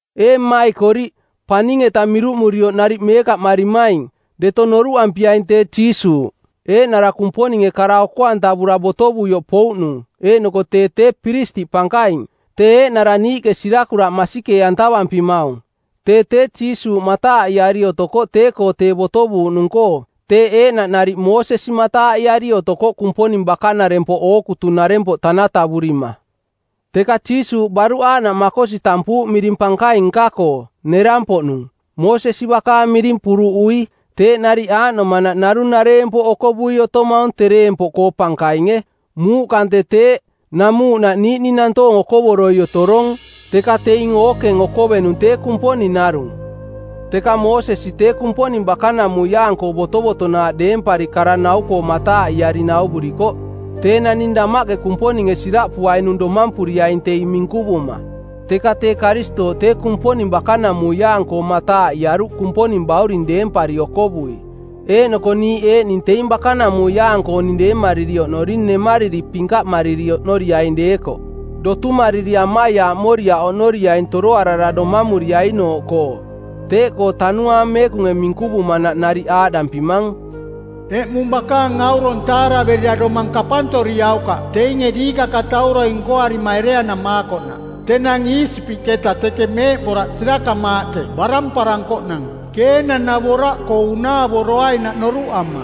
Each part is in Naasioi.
Ee mmaikoriꞌ, paning-eta miruꞌmurioꞌ nariꞌ meekaꞌmarimaing, deto noruꞌampiaing tee Jiisuuꞌ, eeꞌnara Kumponinge kara oko-antavura botovuioꞌ pouꞌnung eeꞌnoko tee tee piristiꞌ pankaing, tee eeꞌnara niiꞌke sirakuraꞌ masikee-antavampimaung. Tee tee Jiisuuꞌ mataaꞌiari otokoꞌ tee-koo tee botovuuꞌnung-koo teeꞌ eeꞌnaꞌ nariꞌ Moosesi mataaꞌiari otokoꞌ Kumponing bakanarempoꞌ ookutunarempoꞌ tanatavurima. Teka Jiisuuꞌ baruꞌ aaꞌnaꞌ makosi tampuuꞌ miring pankaing nka-koo, nerang-poꞌnung, Moosesi bakaang miring puruꞌui. Teeꞌ nariꞌ aaꞌnomanaꞌ narung nareempoꞌ okovui otomaung tereempoꞌkoo pankainge. Muuꞌ kante teeꞌ, namuuꞌnaꞌ niiꞌning nantoong okovoroi otorong, teka teing ookeng okovenung tee Kumponing narung. Teka Moosesi tee Kumponing bakanamuiaang-koo botovotonaaꞌ deempari kara-nau-koo mataaꞌiari nauvurikoꞌ tee naning damaꞌke Kumponinge siraꞌpuainung domampuriaing teing minkuvuma. Teka tee Karistooꞌ tee Kumponing bakanamuiaang-koo mataaꞌiaruꞌ Kumponing bauring deempari okovui, eeꞌnoko niiꞌ eeꞌning teing bakanamuiaang-kooning deemariri oꞌnoring nemariri pinkaꞌmariri oꞌnoriaing deekoꞌ, dotumariri amaiaaꞌmoriaꞌ oꞌnoriaing toroarara domamuriainooꞌkoo. Teeꞌkoo Tanuaang Meekunge minkuvumanaꞌ nariꞌ aaꞌdampimang, “Eꞌmung bakaang aurong taaraverira domang kapantoriaukaꞌ teinge diikakatauroi nkoarima ereanamaakoꞌnaꞌ. Tenang Iisipiꞌketa teke meeꞌboraꞌ sirakamaaꞌke baramparankoꞌnang Keenang-navoraꞌkoo unaavoroainaꞌ noruꞌama,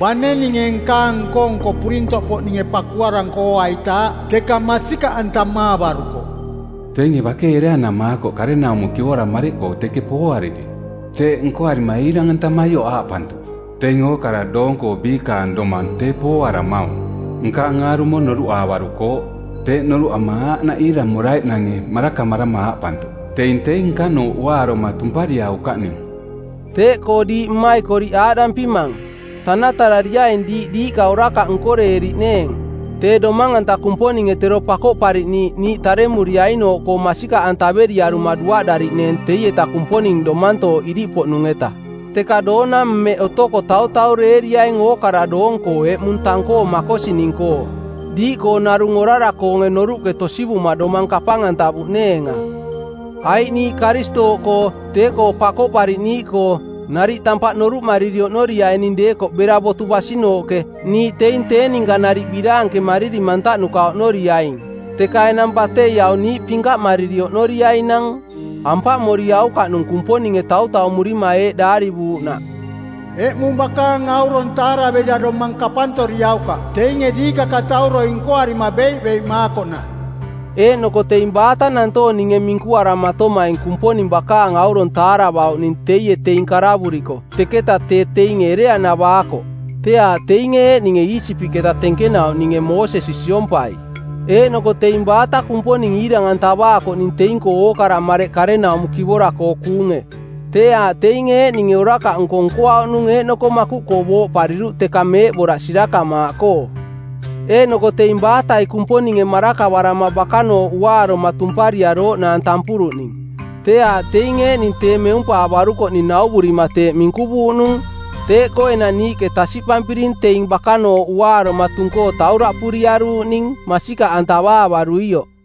bane ninge nkaang nko-nko purintoꞌpoꞌninge pakuaranko ooaitaaꞌ, teka masikaꞌantamaavarukoꞌ; Teinge bakei ereanamaakoꞌ karenaumo kivora mareꞌkoo teke pooariri. Teeꞌ nkoarima iirang-antamaioꞌ aaꞌpantuꞌ, ‘Teing ookara doong-koo biikaang domang tee pooaramaung. Nkaang aarumo noruꞌaavarukooꞌ.’ Teeꞌ noruꞌama aaꞌnaꞌ iiramoraiꞌnange marakamarama aaꞌpantuꞌ, ‘Teing teing nkanooꞌ uaaroma tumpariaukaꞌning.’” Teeꞌkoo diiꞌ mmaikoriꞌ aaꞌdampimang, tanatarariaing diiꞌ diiꞌka orakaꞌ nkorariꞌneeng, tee Domang-anta Kumponinge Tero Pakoꞌpariꞌniiꞌ niiꞌ taremuriainooꞌkoo masikaꞌantaveriaruma duaꞌdariꞌneeng teieta Kumponing domantooꞌ iriꞌpoꞌnung-eta. Teka doona mmeꞌ otoko tautaureeriaing ookara doong-koo “eꞌmung” tang-koo makosining-koo, diiꞌkoo narung orara-koonge noruꞌke tosivuma domang kapang-antavuꞌneenga. Aiꞌ niiꞌ Karistooꞌkoo, Tee Pakoꞌpariꞌniiꞌkoo, nariꞌ tampaꞌ noruꞌmariri oꞌnoriaining deekoꞌ bera botu basinooꞌke, niiꞌ teing tee ninka nariꞌ biraankemariri mantaꞌnuka oꞌnoriaing. Teka enang batei aung niiꞌ pinkaꞌmariri oꞌnoriainang. Ampaꞌmoriaukaꞌnung Kumponinge tautaumurima eeꞌ daarivuuꞌnaꞌ, “Eꞌmung bakaang aurong taaraverira domang kapantoriaukaꞌ teinge diikakatauroi nkoarima beiꞌbeiꞌmaakoꞌnaꞌ.” Eeꞌnoko teing baata nantoong ninge minkuaramatomaing Kumponing bakaang aurong taaravauꞌning teie teing karavuriko teketa tee teinge ereanavaakoꞌ? Tee aaꞌ teinge eeꞌninge Iisipiꞌketa tenkenauꞌninge Moosesi siompai. Eeꞌnoko teing baata Kumponing iirang-antavaakoꞌning teing-koo ookara mareꞌ karenaumo kivora-koo kuunge? Tee aaꞌ teinge eeꞌninge orakaꞌnko nkoauꞌnung eeꞌnoko makuꞌkoo booꞌpariruꞌ teka meeꞌboraꞌ sirakamaaꞌkoo. Eeꞌnoko teing baatai Kumponinge marakavarama bakanooꞌ uaaroma tumpariarooꞌ naang tampuruꞌning? Tee aaꞌ teing eeꞌning tee meumpaavarukoꞌning nauvurima teeꞌ minkuvuuꞌnung. Teeꞌkoo enang niiꞌke tasiꞌpampiring teing bakanooꞌ uaaroma tung-koo tauraꞌpuriaruuꞌning masikaꞌantavaavaruioꞌ.